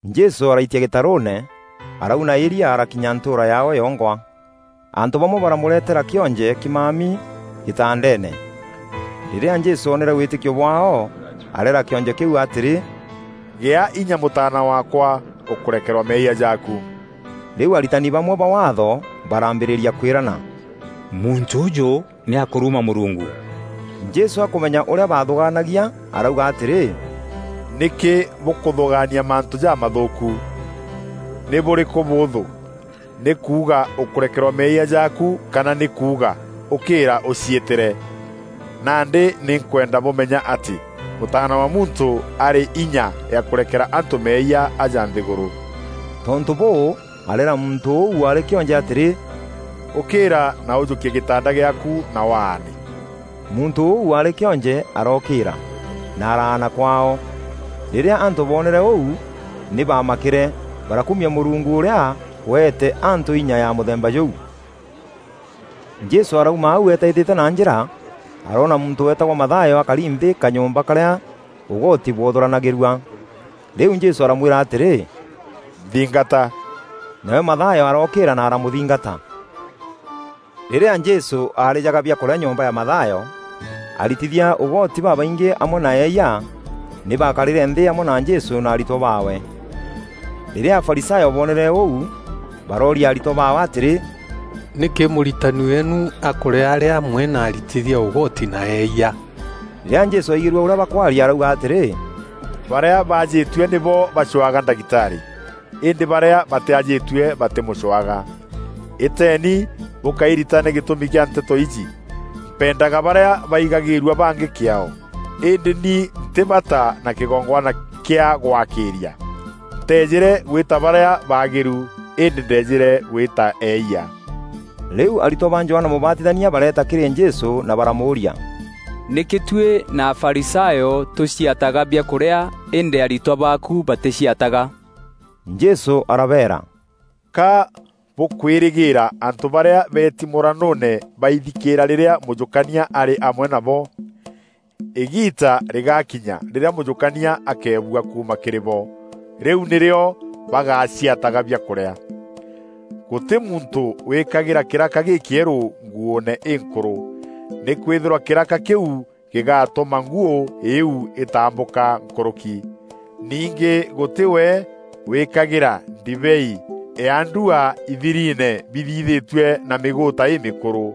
Jesû araitia gîtarûûne, arauna îria arakinya ntûûra yaao yongwa. Antû bamwe baramûretera kîonje kîmami gîtandeene. Rîrîa Jesû oonere wîtîkio bwaao, areera kîonje kîu atîrî, “Gîa inya mûtaana waakwa. Ûkûrekerwa meeyia jaaku.” Rîu aritani bamwe ba Waatho baraambîrîria kwîrana, “Muntû ûjû nî akûruma Mûrungu!” Jesû akûmenya ûrîa baathûgaanagia arauga atîrî, “Nîkî bûkûthûgaania mantû jamathûûku? Nî bûrîkû bûûthû: nî kuuga, ‘Ûkerekerwa meeyia jaaku,’ kana nî kuuga, ‘Ûkîîra ûciîtîre?’ Nandî nî nkwenda bûmenya atî, Mûtaana wa Muntû arî inya ya kûrekera antû meeyia aja nthîgûrû.” Tontû bûû, areera muntû ûu waarî kîonje atîrî, “Ûkîîra na ûjûkie gîtanda gîaaku na waane.” Muntû ûu waarî kîonje arokîîra, na araana kwaao. Rîrîa antû boonere ûu nî baamakîre. Barakumia Mûrungu ûrîa weete antû inya ya mûthemba jûu. Jesû arauma au eetaîtîte na njîra, aroona muntû weetagwa Mathayo akari nthî kanyomba karîa ûgoti bwothûranagîrua. Rîu Jesû aramwîra atîrî, “Nthingata.” Nawe Mathayo arookîîra na aramûthingata. Rîrîa Jesû aarîjaga biakûrîa nyomba ya Mathayo, aritithia ûgoti babaingî amwe na eeyia, nî bakarîre nthî amwe na Jesû na aritwa baawe. Rîrîa Afarisayo boonere ûu, barooria aritwa baawe atîrî, “Nîkî Mûritani weenu akûrîa arî amwe na aritithia ûgoti na eeyia?” Rîrîa Jesû aigîrue ûrîa bakwaria arauga atîrî, “Barîa baajîtue nîbo bacwaga ndagitarî, îndî barîa batîajîtue batîmûcwaga. Îteeni bûkairitane gîtûmi kîa nteto iji, ‘Mpendaga barîa baigagîrua bangî kîaao, îndî ni ntî bata na kîgongwana kîa gwakîîria.’ Nteejîre gwîta barîa baagîru, îndî ndeejîre gwîta eeyia.” Rîu aritwa ba Johana Mûbatithania bareeta kîrî Jesû na baramûûria, “Nîkî tuî na Afarisayo tûciataga biakûrîa îndî aritwa baaku batîciataga?” Jesû arabeera, “Ka bûkwîrîgîîra antû barîa beeti mûranûûne baithikîîra rîrîa mûjûkania arî amwe nabo? Îgiita rîgaakinya rîrîa mûjûkania akeebua kuuma kîrî bo. Rîu nîrîo bagaciataga biakûrîa. Gûtî muntû wîkagîra kîraka gîkîerû nguûne înkûrû. Nîkwîthîrwa kîraka kîu gîgatûma nguû îîu îtambûka nkûrûki. Ningî gûtî we wîkagîra ndibei ya ndua ithiriine bithithîtue na mîgûûta îmîkûrû.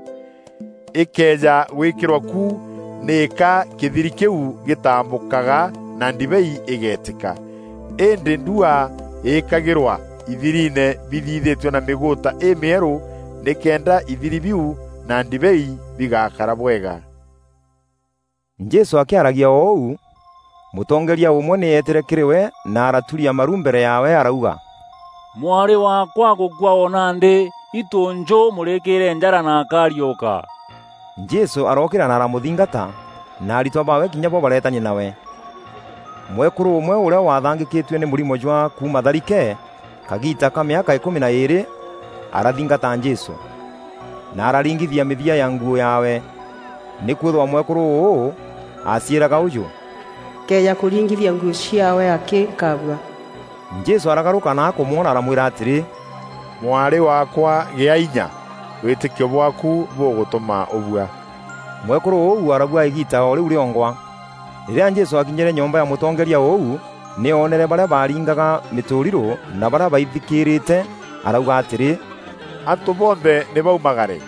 Îkëeja gwîkîrwa ku, nîka kîthiri kîu gîtambûkaga na ndibei îgeetîka. Îndî ndua îkagîrwa ithiriine bithithîtue na mîgûûta îmîerû nîkenda ithiri biu na ndibei bigakara bwega.” Jesû akîaragia o ûu, mûtongeeria ûmwe nî eetîre kîrî we na araturia maru mbere yaawe arauga, “Mwarî waakwa agûkua o nandî. Îtû njû ûmûrîkîîre njara na akariûka.” Jesû arookîîra na aramûthingata na aritwa baawe kinya bo bareetania nawe. Mwekûrû ûmwe ûrîa waathangîkîtue nî mûrimo jwa kuuma tharike kagiita ka mîaka îkûmi na îîrî, arathingata Jesû, na araringithia mîthia ya nguû yaawe. Nîkwîthîrwa mwekûrû ûû aaciîraga ûjû, “Nkëeja kûringithia nguû ciaawe akî, nkabua.” Jesû aragarûka na akûmwona aramwîra atîrî, “Mwarî waakwa, gîa inya! Wîtîkio bwaaku bûgûtûma ûbua.” Mwekûrû ûu arabua îgiita o rîu rîongwa. Rîrîa Jesû aakinyîre nyomba ya mûtongeeria ûu nî oonere barîa baaringaga mîtûrirû na barîa baithikîrîte arauga atîrî, “Antû bonthe nî baumagare!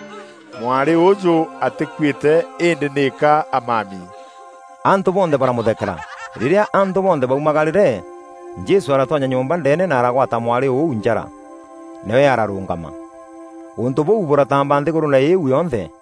Mwarî ûûjû atîkuîte îndî nîka amami.” Antû bonthe baramûthekera. Rîrîa antû bonthe baumagarîre, Jesû aratonya nyomba ndeene na aragwata mwarî ûu njara, nawe ararûngama. Ûntû bûu bûrataamba nthîgûrûûne îîu yonthe.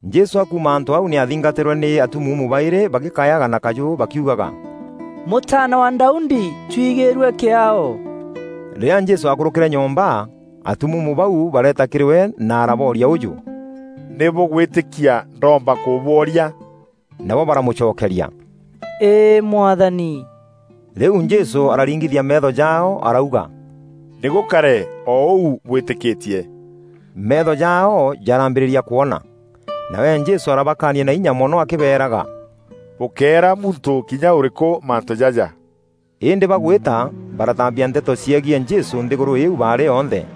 Jesû akuuma antû au nî athingatîrwe nî atumuumu baîrî bagîkayaga na kajû bakiugaga, “Mûtaana wa Daudi, twigîîrue kîaao!” Rîrîa Jesû akûrûkîre nyomba, atumuumu bau bareeta kîrî we na arabooria ûjû, “Nî bûgwîtîkia ndoomba kûbworia?” Nabo baramûcokeria, “Îî Mwathani.” Rîu Jesû araringithia meetho jaao, arauga, “Nî gûkare o ûu bwîtîkîtie!” Meetho jaao jarambîrîria kwona. Nawe Jesû arabakaania na inya mono akîbeeraga, “Bûkéera muntû kinya ûrîkû mantû jaja.” Îndî bagûîta, barataambia nteto ciegiî Jesû nthîgûrû îîu baarî yonthe.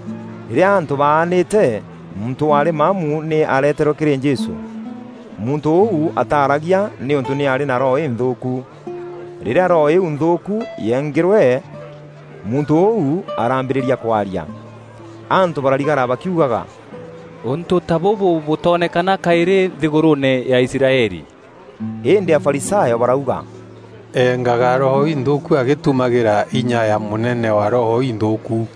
Rîrîa antû baanîîte, muntû waarî maamu nî aareterwe kîrî Jesû. Muntû ûu ataaragia nîûntû nî aarî na roho înthûûku. Rîrîa roho îîu nthûûku yeengîîrwe, muntû ûu araambîîrîa kwaria. Antû bararigara bakiugaga, “Ûntû ta bûbû bûtoonekana kaîrî nthîgûrûûne ya Israeli!” Îndî Afarisayo barauga, “Engaga roho inthûûku agîtumagîra inya ya mûnene wa roho inthûûku.”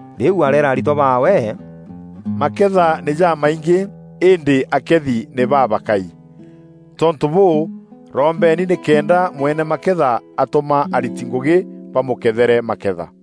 Rîu areera aritwa baawe, “Maketha nî jamaingî, îndî akeethi nî babakai. Tontû bûû, rombeeni nîkenda mweene maketha atûma ariti ngûgî bamûkeethere maketha.”